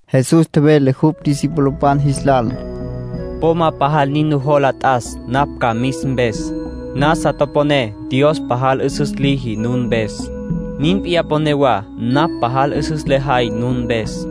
Jesús tjevele jupj discipulopan jis lal: —Po ma pajal nin nujola t'as napj ca mis mpes. Nasa toponé Dios pajal 'üsüs liji nun mpes. Nin p'iyá mponé wa napj pajal 'üsüs lejay nun mpes.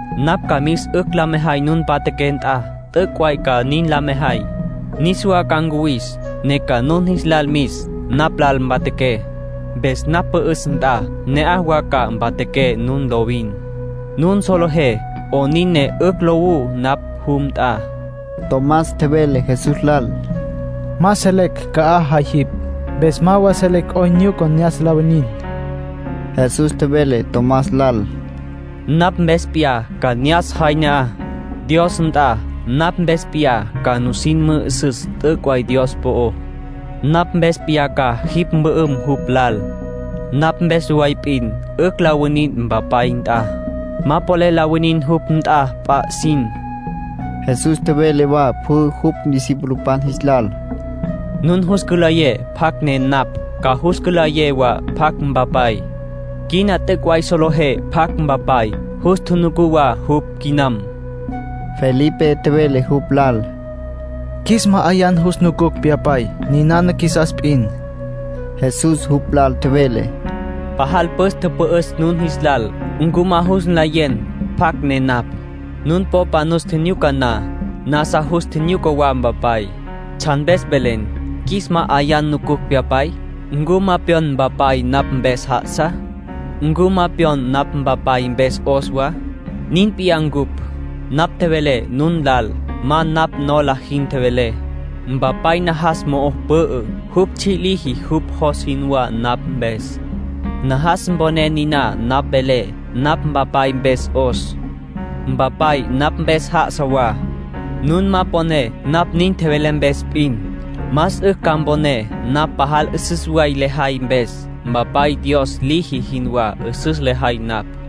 Napj ca mis 'ücj la mejay nun mpatjaqué nt'a. T'üc' way ca nin la mejay. Niswa ca ncuwis, ne ca nun jis lal mis napj lal mpatjaqué. Mpes napj pü'üs nt'a ne'aj wa ca mpatjaqué nun lovin. Nun solejé 'onin ne 'ücj lowú napj jum nt'a. Tomás tjevele Jesús lal: —Ma selecj ca'aj jay jipj. Mpes ma wa selecj 'oyn nyuca ne'as la winin. Jesús tjevele Tomás lal: —Napj mpes p'iyá ca ne'as jay ne'aj, Dios nt'a. Napj mpes p'iyá ca nusin mü'üsüs t'üc' way Dios po'ó. Napj mpes p'iyá ca jipj mpü'üm jupj lal. Napj mpes way p'in 'ücj la winin Mpapay nt'a. Ma polel la winin jupj nt'a p'a 'isin. Jesús tjevele wa pjü jupj discipulopan jis lal: —Nun jus cülayé pjacj ne napj, ca jus cülayé wa pjacj Mpapay. Quina t'üc' way solejé pjacj Mpapay, jus tjunucú wa jupj quinam. Felipe tjevele jupj lal: —Qjuis ma'ayan jus nucucj Pyapay. Ninana qjuisas p'in. Jesús jupj lal tjevele: —Pajal püs tüpü'üs nun jis lal. ¿Ncu ma jus nlayen pjacj ne napj? Nun popa nus tjinyuca na, nasa jus tjinyuca wa Mpapay. ¿Tsjan mpes velen: ‘Qjuis ma'ayan nucucj Pyapay?’ ¿Ncu ma pyon Mpapay napj mpes já'asa? ¿Ncu ma pyon napj Mpapay mpes 'os wa? Nin p'iyá ncupj. Napj tjevelé nun lal, ma napj nola jin tjevelé. Mpapay najas mo'o pü'ü. Jupj tsji' liji jupj jos jinwá napj mpes. Najas mponé niná napj velé. Napj Mpapay mpes 'os. Mpapay napj mpes já'asa wa. Nun ma poné napj nin tjevelé mpes p'in, más 'ücj ca mponé napj pajal 'üsüs way lejay mpes. Mpapay Dios liji jinwá 'üsüs lejay napj.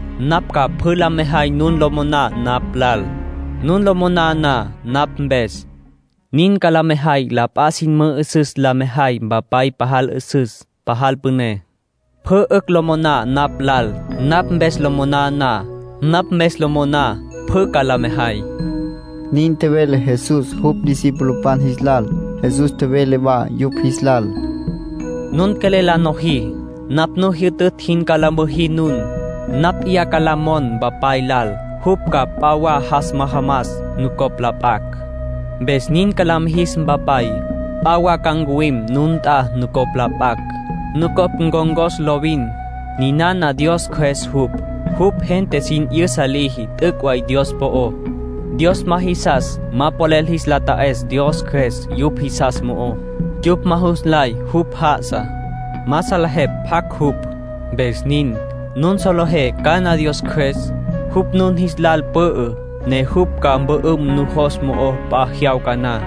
Napj ca pjü la mejay nun lo moná napj lal, nun lo moná na napj mpes. Nin ca la mejay la p'a sin mü'üsüs la mejay Mpapay pajal 'üsüs, pajal püné. Pjü 'ücj lo moná napj lal, napj mpes lo moná na. Napj mpes lo moná, pjü ca la mejay —nin tjevele Jesús jupj discipulopan jis lal. Jesús tjevele wa yupj jis lal: —Nun quelel la nojí, napj nu tjijyütütj jin ca la müjí nun. Napj p'iyá ca la mon Mpapay lal jupj ca p'a wa jas majamas nucopj la p'acj. Mpes nin ca la mijis Mpapay. P'a wa ca ncuwim nun nt'a nucopj la p'acj. Nucopj ncon̈cos lovin. Ninana Dios Cjües jupj. Jupj gente sin 'yüsa liji t'üc' way Dios po'ó. Dios ma jisas ma polel jis la ta'es Dios Cjües yupj jisas mo'ó. Yupj ma jus nlay jupj já'asa. Ma salejepj pjacj jupj, mpes nin. Nun solejé cana Dios Cjües. Jupj nun jis lal pü'ü, ne jupj ca mpü'üm nujos mo'ó p'a jyawca na.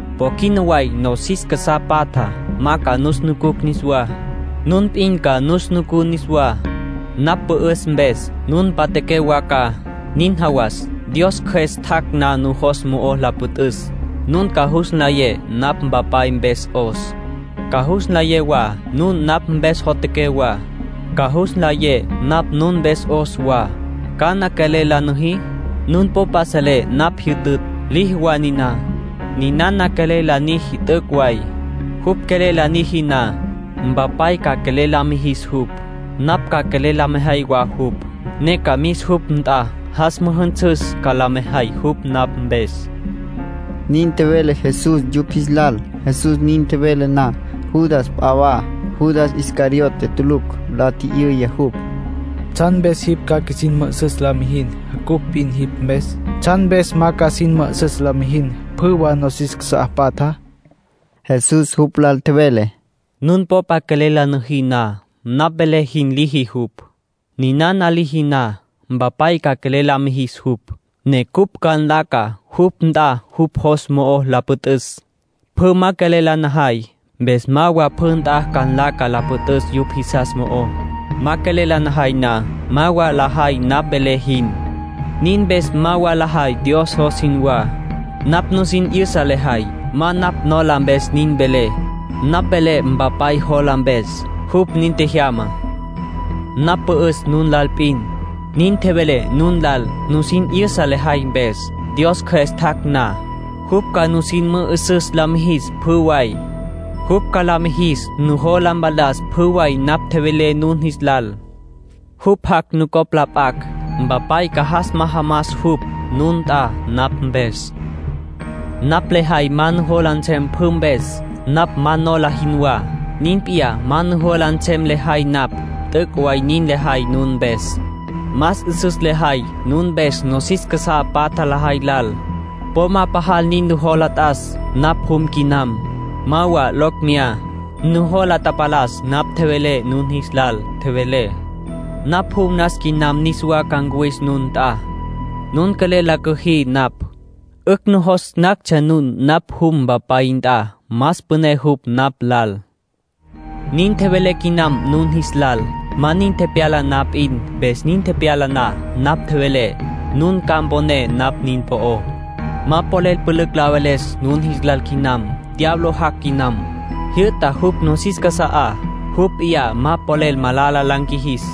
Po quina way nosis casá patjá ma ca nus nucucj niswá; nun p'in ca nus nucú niswá. Napj pü'üs mpes, nun mpatjaqué wa ca. Nin jawas, Dios Cjües tjac' na nujos mo'o la püt'üs, nun ca jus nlayé napj Mpapay mpes 'os. Ca jus nlayé wa nun napj mpes jotjaqué wa. Ca jus nlayé napj nun mpes 'os wa. ¿Cana quelel la niji? Nun popa selé napj jyütütj, liji wa niná, ninana quelel la niji t'üc' way. Jupj quelel la niji na, Mpapay ca quelel la mijis jupj. Napj ca quelel la mejay wa jupj, ne ca mis jupj nt'a, jas mü'üsüs ca la mejay jupj napj mpes —nin tjevele Jesús yupj jis lal. Jesús nin tjevele na, Judas p'a wa (Judas Iscariote tulucj) la tji'yüya jupj: —¿Tsjan mpes jipj ca qjuisin mü'üsüs la mijin cupj p'in jipj mpes? ¿Tsjan mpes ma ca sin mü'üsüs la mijin pjü wa nosis casá patjá? Jesús jupj lal tjevele: —Nun popa quelel la niji na, napj velé jin liji jupj. Ninana liji na, Mpapay ca quelel la mijis jupj, ne cupj ca nlaca jupj nt'a jupj jos mo'o la püt'üs. Pjü ma quelel la najay, mpes ma wa pjü nt'a ca nlaca la püt'üs yupj jisas mo'ó. Ma quelel la najay na, ma wa lajay napj velé jin. Nin mpes ma wa lajay Dios jos jinwá. Napj nusin 'yüsa lejay, ma napj nola mpes nin velé. Napj velé Mpapay jola mpes. Jupj nin tjejyama. ”Napj pü'üs nun lal p'in, nin tjevelé nun lal, nusin 'yüsa lejay mpes. Dios Cjües tjac' na, jupj ca nusin mü'üsüs la mijis pjü way. Jupj ca la mijis nujola mpalas pjü way napj tjevelé nun jis lal. Jupj jac' nucopj la p'acj. Mpapay ca jas majamas jupj nun nt'a napj mpes. ”Napj lejay ma nujola nsem pjü mpes. Napj ma nola jinwá, nin p'iyá ma nujola nsem lejay napj. T'üc' way nin lejay nun mpes. Más 'üsüs lejay nun mpes nosis casá patja lajay lal. Po ma pajal nin nujola t'as napj jum quinam. Ma wa locj meyá. Nujola tapalas napj tjevelé nun jis lal. Tjevelé: ‘Napj jum nas quinam, niswa ca ncuwis nun nt'a’. Nun quelel la cüjí napj, 'ücj nujos nactsja nun napj jum Mpapay nt'a. Más püné jupj napj lal. Nin tjevelé quinam nun jis lal, ma nin tepyala na p'in, mpes nin tepyala na napj tjevelé, nun ca mponé napj nin po'ó. ”Ma polel pülücj la veles nun jis lal quinam. Diablo jac' quinam. Jyü'ta jupj nosis casa'á. Jupj p'iyá ma polel malala la nqjuijis.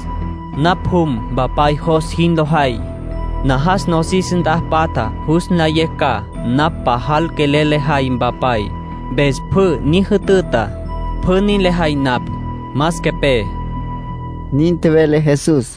Napj jum Mpapay jos jin lo jay. Najas nosis nt'a patja jus nlayecj ca napj pajal quelel lejay Mpapay, mpes pjü ni jütüta, pjü nin lejay napj. Mas quepé —nin tjevele Jesús.